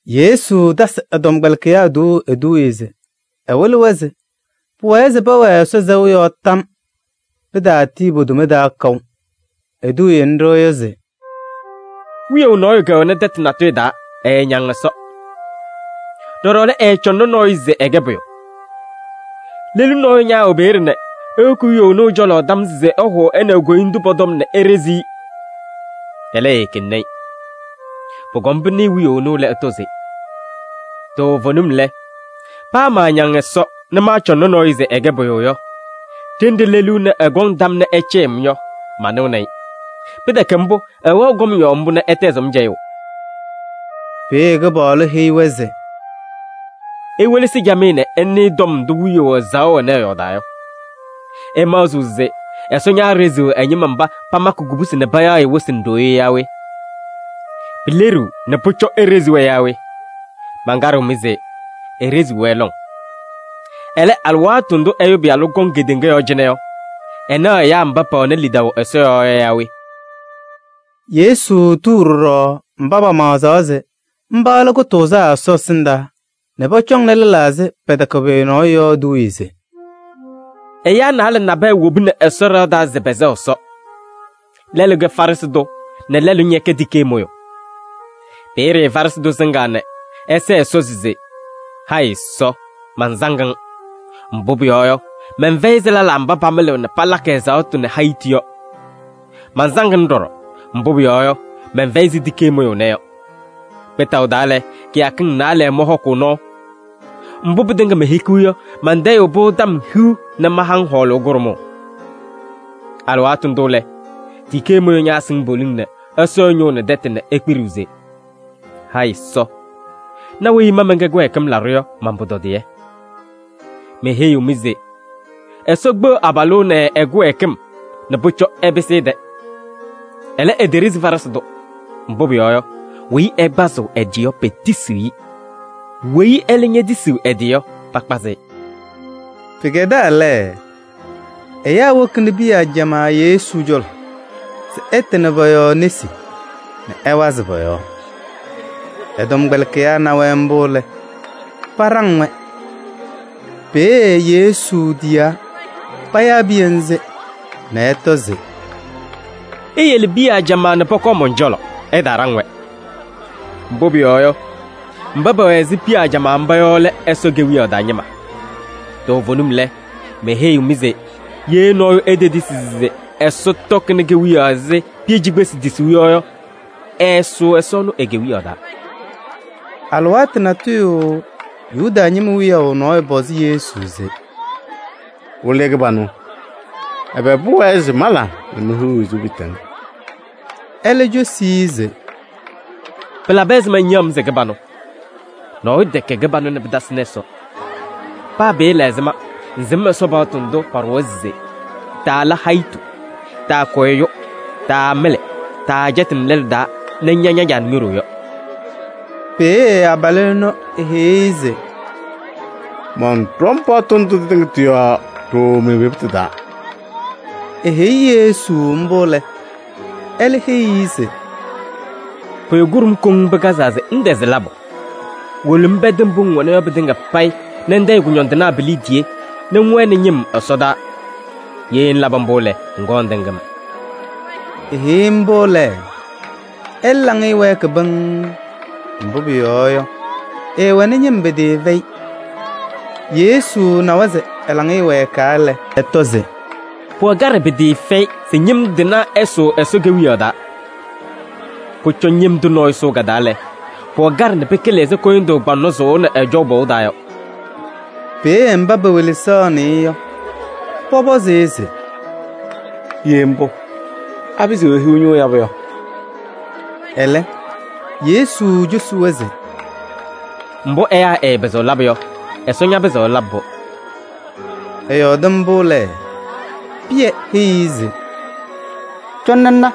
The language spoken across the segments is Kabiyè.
Yesu tasɩ ɛ-tɔmkpɛlɩkɩyaa tuuu eduuye se ɛwɩlɩ-wɛ se pʋwɛɛ se pɛwɛɛ Ɛsɔ sɛʋ yɔɔ tam. Pɩtaatii po-toma taa kaʋ. Eduuye nɖɩ yɔ se: “Wiyaʋ nɔɔyʋ kɛwɛnɩ tɛtʋ natʋyʋ taa, ɛɛñaŋ Ɛsɔ. Ɖɔɖɔ lɛ, ɛɛcɔŋnɩ nɔɔyʋ se ɛkɛ pʋyʋ. Lelu nɔɔyʋ ñaawɛ peeye nɛ ewoki wiyaʋ ɛnʋ ɛ-cɔlɔ tam se ɛhʋʋ ɛ nɛ e-koyindu pɔ-tɔm nɛ eɖezi-i. Ɛlɛ, eekeŋni-i. Pʋkɔm pɩnɩɩ wiyaʋ ɛnʋ lɛ, ɛtɔ se: ‘Toovenim lɛ, paa maañaŋ Ɛsɔ nɛ maacɔŋnɩ nɔɔyʋ se ɛkɛ pʋyʋ yɔ, ɖenɖe lelu ɛnɛ ɛkɔŋ tam nɛ ɛcɛyɩɣ-m yɔ, manɩɣnɩ-ɩ. Pɩtɛkɛ mbʋ, ɛwɛɣ kɔm yɔɔ mbʋ nɛ ɛtɛzɩɣ-m cɛyʋʋ.’” Peeye Kɩpaɣlʋ heyi-wɛ se: “Iwelesi camɩyɛ nɛ ɩnɩɩ tɔm ndʋ wiyaʋ ɛzaɣʋ ɛnɛ ɛyɔɔdaa yɔ. Ɩmaɣzɩɣ se Ɛsɔ ñaaɖeziɣ ɛ-ñɩma mba pamakɩ kubusi nɛ payaɣ-ɩ wɩsɩ nɛ ɖoo yɔ yaa we? Pileɖiɣ nɛ pʋcɔ eɖezi-wɛ yaa we? Mankaɖɩɣ-mɩ se: eɖeziɣ-wɛ lɔŋ. Ɛlɛ, alɩwaatʋ ndʋ Ɛyʋ Pɩyalʋ kɔŋ kedeŋa yɔɔ cɩnɛ yɔ, ɛnaɣ ɛyaa mba pɛwɛnɩ lidaʋ Ɛsɔ yɔɔ yɔ yaa we?” Yesu tuu ɖɔɖɔ mba pamaɣzaɣ se mba lɛ kʋtʋʋzaa Ɛsɔ ɛsɩndaa nɛ pɔcɔŋnɩ lɛlaa se pɛtɛkɛ pʋyʋ yɔ eduuye se: “Ɛyaa naalɛ nabɛyɛ wobini Ɛsɔ ɖɩɣa taa se pɛsɛɣ Ɛsɔ. Lɛlʋ kɛ Farɩsɩ tʋ nɛ lɛlʋ ñɛkɛ tikee mʋyʋ. Peeye Farɩsɩ tʋ sɩŋaa nɛ ɛsɛɛ Ɛsɔ se: ‘Hayɩ Ɛsɔ! Mansaŋ-ŋ. Mbʋ pʋyɔɔ yɔ, mɛnfɛyɩ ɛzɩ lɛlaa mba pamɩlɩɣ nɛ palakɩ ɛzaɣtʋ nɛ hayitu yɔ. Mansaŋ-ŋ ɖɔɖɔ, mbʋ pʋyɔɔ yɔ, mɛnfɛyɩ ɛzɩ tikee mʋyʋ ɛnɛ yɔ. Kpɩtaʋ taa lɛ, kɩyakɩŋ naalɛ mɔhɔkʋʋ nɔɔ. Mbʋ pɩtɩŋa mehikiɣ yɔ, mantayɩɣ-pʋ tɔm hiu nɛ mahaɣ-ŋ hɔɔlʋʋ kʋɖʋmʋʋ.’ Alɩwaatʋ ndʋ lɛ, tikee mʋyʋ ñaasɩŋ poliŋ nɛ ɛsɔ ɛ-ñʋʋ nɛ tɛtʋ nɛ ekpiɖiɣ se: ‘Hayɩ Ɛsɔ! Na weyi ma mɛnkɛ kɩwɛɛkɩm laɖʋ yɔ man-pʋtɔdɩyɛ!’ Meheyiɣ-mɩ se Ɛsɔ kpeɣ abalʋ ɛnɛ ɛ-kɩwɛɛkɩm nɛ pʋcɔ ɛpɩsɩ ɛ-tɛ. Ɛlɛ, eteɖezi Farɩsɩ tʋ. Mbʋ pʋyɔɔ yɔ, weyi ɛkpazɩɣ ɛ-tɩ yɔ, petisiɣ-i. Weyi ɛlɛ ñetisiɣ ɛ-tɩ yɔ, pakpazɩ-ɩ.” Pɩkɛdaa lɛ, ɛyaa wokini piya ajamaa Yesu cɔlɔ se ɛtɩnɩ pɔ-yɔɔ nesi nɛ ɛwazɩ pɔ-yɔɔ. Ɛ-tɔmkpɛlɩkɩyaa na-wɛ mbʋ lɛ, paɖaŋ-wɛ. Peeye Yesu tiyaa payaa piya ŋzɩ nɛ ɛtɔ se: “Iyele piya ajamaa nɛ pɔkɔɔ mɔn-cɔlɔ, ɩtaaɖaŋ-wɛ. Mbʋ pʋyɔɔ yɔ, mba pɛwɛ ɛzɩ piya ajamaa mba yɔ lɛ Ɛsɔ Kewiyaɣ taa ñɩma. Toovenim lɛ, meheyiɣ-mɩ se: ye nɔɔyʋ etetisi se Ɛsɔ tɔkɩnɩ kewiyaɣ ɛzɩ piya cikpesi tisuu yɔ yɔ, ɛɛsʋʋ Ɛsɔ ɛnʋ e-Kewiyaɣ taa.” Alɩwaatʋ natʋyʋ Yuda ñɩma wiyaʋ nɔɔyʋ pɔzɩ Yesu se: “Wɩlɩyʋ kɩbanʋ! Ɛbɛ pʋwɛɛ se mala nɛ mehiɣ wezuu pɩɩtɛŋ?” Ɛlɛ ecosi-i se: “Pɩlabɩ ɛzɩma ŋyaɣ-m se kɩbanʋ? Nɔɔyʋ tɛkɛ kɩbanʋ nɛ pɩtasɩnɩ Ɛsɔ. Paa pɩɩla ɛzɩma ŋsɩm Ɛsɔ paɣtʋ ndʋ paɖʋwa se: taala hayitu, taakʋ ɛyʋ, taamɩlɩ, taacɛtɩnɩ lɛlʋ taa nɛ ŋña ña-caa nɛ ño-ɖoo yɔ?” Peeye abalʋ ɛnʋ eheyi-i se: “Mɔnɖɔm paɣtʋ ndʋ tɩtɩŋa tɩ-yɔɔ ɖooo me-evebutu taa.” Eheyi Yesu mbʋ lɛ, ɛlɛ heyi-i se: “Pʋyʋ kʋɖʋm koŋ pɩkazaa se ŋtɛzɩ labʋ. Wolo ŋpɛdɩ mbʋ ŋwɛna yɔ pɩtɩŋa payɩ nɛ ŋtayɩ kʋñɔndɩnaa pi-liidiye nɛ ŋwɛnɩ ñɩm ɛsɔdaa. Ye ŋlabɩ mbʋ lɛ, ŋkɔɔ ŋtɩŋ-m.” Eheyi-i mbʋ lɛ, ɛlɛ laŋɩyɛ wɛɛkɩ pɩŋŋ, mbʋ pʋyɔɔ yɔ, ɛɛwɛnɩ ñɩm pɩtɩɩfɛyɩ. Yesu nawa se ɛ-laŋɩyɛ wɛɛkaa lɛ, ɛtɔ se: “Pʋwɛ kaɖɛ pɩtɩɩfɛyɩ se ñɩm tɩnaa ɛsʋʋ Ɛsɔ Kewiyaɣ taa! Pʋcɔ ñɩm tʋ nɔɔyʋ sʋʋ ka-taa lɛ, pʋwɛ kaɖɛ nɛ pɩkɩlɩ ɛzɩ kʋyʋndʋʋ kpaŋnɔ sʋʋnɩ ɛjɔʋ pɔʋ taa yɔ.” Peeye mba pewelesaɣnɩ-ɩ yɔ, pɔpɔzɩ-ɩ se: “Ye mbʋ, apɩzɩɣ ehiɣ ñʋʋ yabʋ yɔ?” Ɛlɛ Yesu cosi-wɛ se: “Mbʋ ɛyaa ɛɛpɩzɩɣ labʋ yɔ, Ɛsɔ ñapɩzɩɣ ɛlabɩ-pʋ.” Ɛyɔɔdɩ mbʋ lɛ, Pɩyɛ heyi-i se: “Cɔnɩ ŋna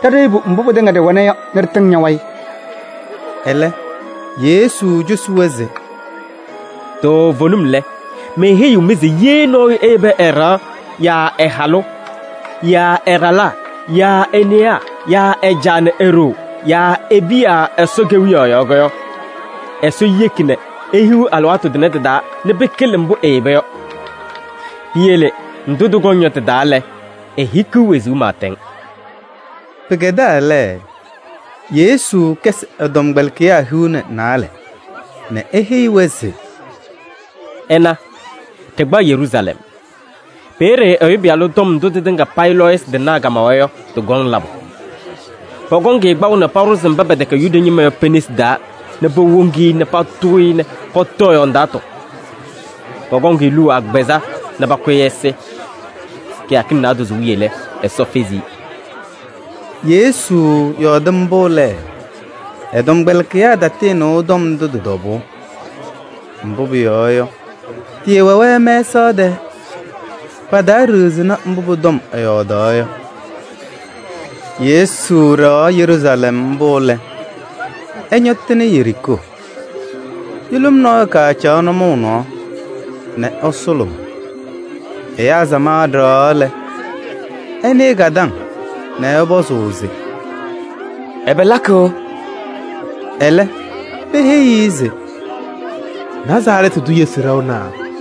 ɖa ɖeyebu mbʋ pɩtɩŋa ɖɩwɛna yɔ nɛ ɖɩtɩŋ ña-wayɩ.” Ɛlɛ Yesu cosi-wɛ se: “Toovenim lɛ, meheyiɣ-mɩ se ye nɔɔyʋ eyebi ɛ-ɖɩɣa yaa ɛ-halʋ yaa ɛ-ɖalaa yaa e-newaa yaa ɛ-caa nɛ e-ɖoo yaa e-piya Ɛsɔ Kewiyaɣ yɔɔ yɔ, Ɛsɔ yeki nɛ ehiɣ alɩwaatʋ tʋnɛ tɩ-taa nɛ pɩkɩlɩ mbʋ eyeba yɔ. Piyele ndʋ tɩkɔŋ yɔ tɩ-taa lɛ, ehikiɣ wezuu pɩɩtɛŋ.” Pɩkɛdaa lɛ, Yesu kɛsɩ ɛ-tɔmkpɛlɩkɩyaa hiu nɛ naalɛ nɛ eheyi-wɛ se: “Ɩna, ɖɩkpaɣ Yeruusalɛm. Peeye Ɛyʋ Pɩyalʋ tɔm ndʋ tɩtɩŋa payɩ lɔɔyɩsɩ tɩnaa kamawa yɔ, tɩkɔŋ labʋ. Pɔkɔŋ-ɩ kpaʋ nɛ paɖʋzɩ mba pɛtɛkɛ Yuda ñɩma yɔ pe-nesi taa nɛ powoŋ-i nɛ patʋʋ-ɩ nɛ pɔtɔ ɛ-yɔɔ ndaatʋ. Pɔkɔŋ-ɩ luu agbazɛɛ nɛ pakʋ-ɩ ɛsɩ. Kɩyakɩŋ naadozo wiye lɛ, Ɛsɔ fezi-i.” Yesu yɔɔdɩ mbʋ lɛ, ɛ-tɔmkpɛlɩkɩyaa tatɩɩnɩʋ tɔm ndʋ tɩ-tɔbʋʋ. Mbʋ pʋyɔɔ yɔ, tɩɩwɛ-wɛ mɛsaɣ tɛɛ. Pataaɖiɣzini mbʋ pʋ-tɔm ɛyɔɔdaɣ yɔ. Yesu ɖɛɣaɣ Yeruusalɛm mbʋ lɛ, ɛñɔtɩnɩ Yeriikoo. Yʋlʋm nɔɔyʋ kacaɣ nʋmɔʋ nɔɔ nɛ ɛsʋlʋmʋʋ. Ɛyaa samaɣ ɖɛɣaɣ lɛ, ɛnɩɩ ka-taŋ nɛ ɛpɔzɩ se: “Ɛbɛ lakɩɣ?” Ɛlɛ peheyi-i se: “Nazarɛɛtɩ tʋ Yesu ɖɛɣna.”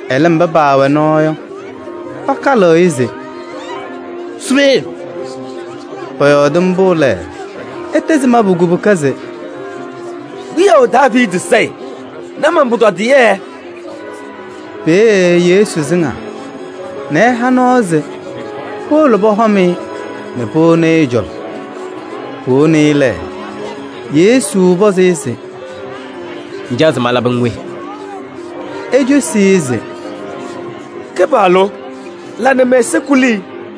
Ɛlɛ mba paawɛ nɔɔ yɔ, pakalɩ-ɩ se: “Su peeye!” Pɔyɔɔdɩ mbʋ lɛ, ɛtɛzɩ mabʋ kubuka se: “Wiyaʋ Daaviidi Sayɩ! Na man-pʋtɔdɩyɛ!” Peeye Yesu sɩŋaa nɛ ɛha nɔɔ se powolo pɔhɔm-ɩ nɛ powoni-i ɛ-cɔlɔ. Powoni-i lɛ, Yesu pɔzɩ-ɩ se: “Ŋcaɣ se malabɩ-ŋ we?” Ecosi-i se: “Kɩpaɣlʋ! La nɛ mɛ-ɛza kuli.”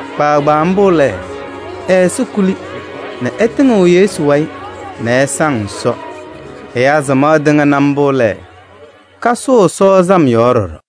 Kpaagbaa mbʋ lɛ, ɛ-ɛza kuli nɛ ɛtɩŋɩɣ Yesu wayɩ nɛ ɛsaŋ Ɛsɔ. Ɛyaa samaɣ tɩŋa na mbʋ lɛ, kasʋʋ Ɛsɔ sam yɔɔ ɖɔɖɔ.